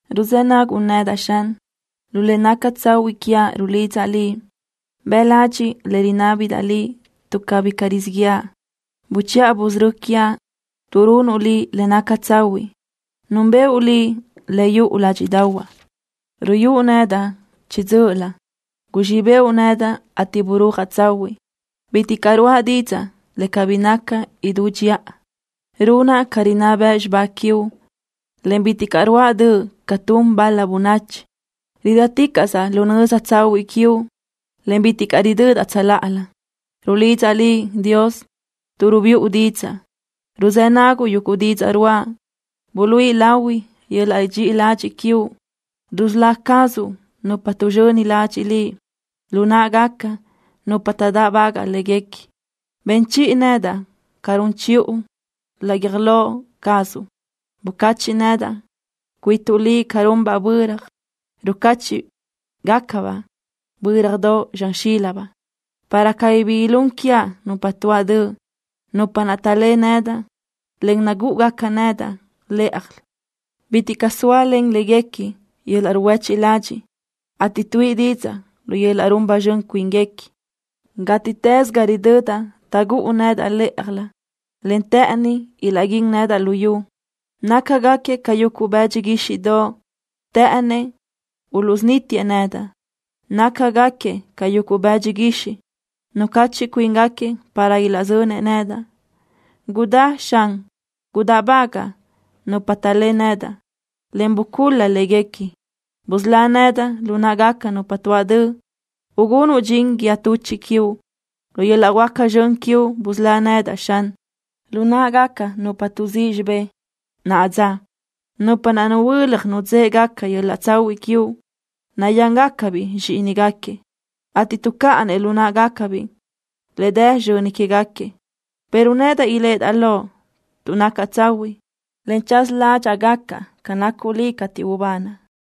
Ruzë́ naguʼ nedaʼ, Xan. Lu le naca tsahuiʼ quiaʼ rulidzaʼ Liʼ. Bëʼ ladxiʼ le rinábidaʼ Liʼ tuʼ cabí caʼ rizíʼ yëʼa. Buchiʼa busörö́ quiaʼ tuʼ runuʼ Liʼ le naca tsahuiʼ. Núnbëʼu Liʼ le yuʼu ládxiʼdaʼahuaʼ. Ruyúʼ nedaʼ chiʼi dzö́ʼölö. Guzxíʼ bëʼu nedaʼ, ateʼ burúajaʼ tsahuiʼ. Bitiʼ caʼ ruáʼa didzaʼ le cabí naca idú dxiʼa. Runaʼ ca rinná bëʼ xibá quiuʼ, en bitiʼ caʼ ruáʼa döʼ ca tun bal-la bönachi. Ridáticaʼsaʼ laʼ nöza tsahuiʼ quiuʼ, en bitiʼ caʼ ridödaʼ tsöláʼalö. Rulidzaʼ Liʼ, Dios, tuʼ rubiʼu didzaʼ. Ruzë́ naguʼ yuguʼ didzaʼ ruáʼa. Buluíʼi lahui yöl-laʼ dxiʼi ladxiʼ quiuʼ. Rusölá cazuʼ nupa tuʼzxöni ladxiʼ Liʼ lu náʼagaca nupa taʼdáʼbagaʼ léguequi. Ben chiʼi nedaʼ ca run chiʼu laʼ guiöj lo cazuʼ. Bucachiʼ nedaʼ cuituʼ Liʼ ca runbaʼ böra, rucáchiʼgacabaʼ bö́radoʼ zxan xílabaʼ, para cabí bi ilún quiaʼ nupa tuáʼ döʼ, nupa naʼ taʼlé nedaʼ, en nagúʼugaca nedaʼ lë́ʼajlö. Bitiʼ caʼ zóalen léguequi yöl-laʼ ruhuéchiʼ ladxiʼ, ateʼ tuíʼi didzaʼ lu yöl-laʼ run ba zxön cuínguequi. Gátiʼtës ga ridödaʼ taʼgúʼu nedaʼ lë́ʼajlö, en të́ʼëni ilaʼguín nedaʼ luyú. Nácagaquiëʼ ca yuguʼ bëdxi guíxiʼdoʼ. Të́ʼënëʼ uluʼsunítiëʼ nedaʼ. Nácagaquiëʼ ca yuguʼ bëdxi guixiʼ. Nucachiʼ cuíngaquiëʼ para ilaʼzönëʼ nedaʼ. Gudá, Xan, gudáʼbagaʼ nupa taʼlé nedaʼ, en bucul-la léguequi. Busölá nedaʼ lu náʼagaca nupa tuáʼ döʼ, ugunuʼ dxin guíë tuchiʼ quiuʼ. Lu yöl-laʼ huáca zxön quiuʼ busölá nedaʼ, Xan, lu náʼagaca nupa tuʼzíʼ xibé naʼa dza, nupa naʼ nuhuö́laj nudzë́ʼegaca yöl-laʼ tsahuiʼ quiuʼ. Nayángacabiʼ zxíʼinigaquiëʼ, ateʼ tuʼcáʼanëʼ lu náʼagacabiʼ le dë sizxöni quégaquiëʼ. pero nedaʼ iléʼedaʼ loʼ tuʼ nacaʼ tsahuiʼ, en tsaza ládxaʼa gacaʼ ca nacuʼ Liʼ cateʼ ubanaʼ.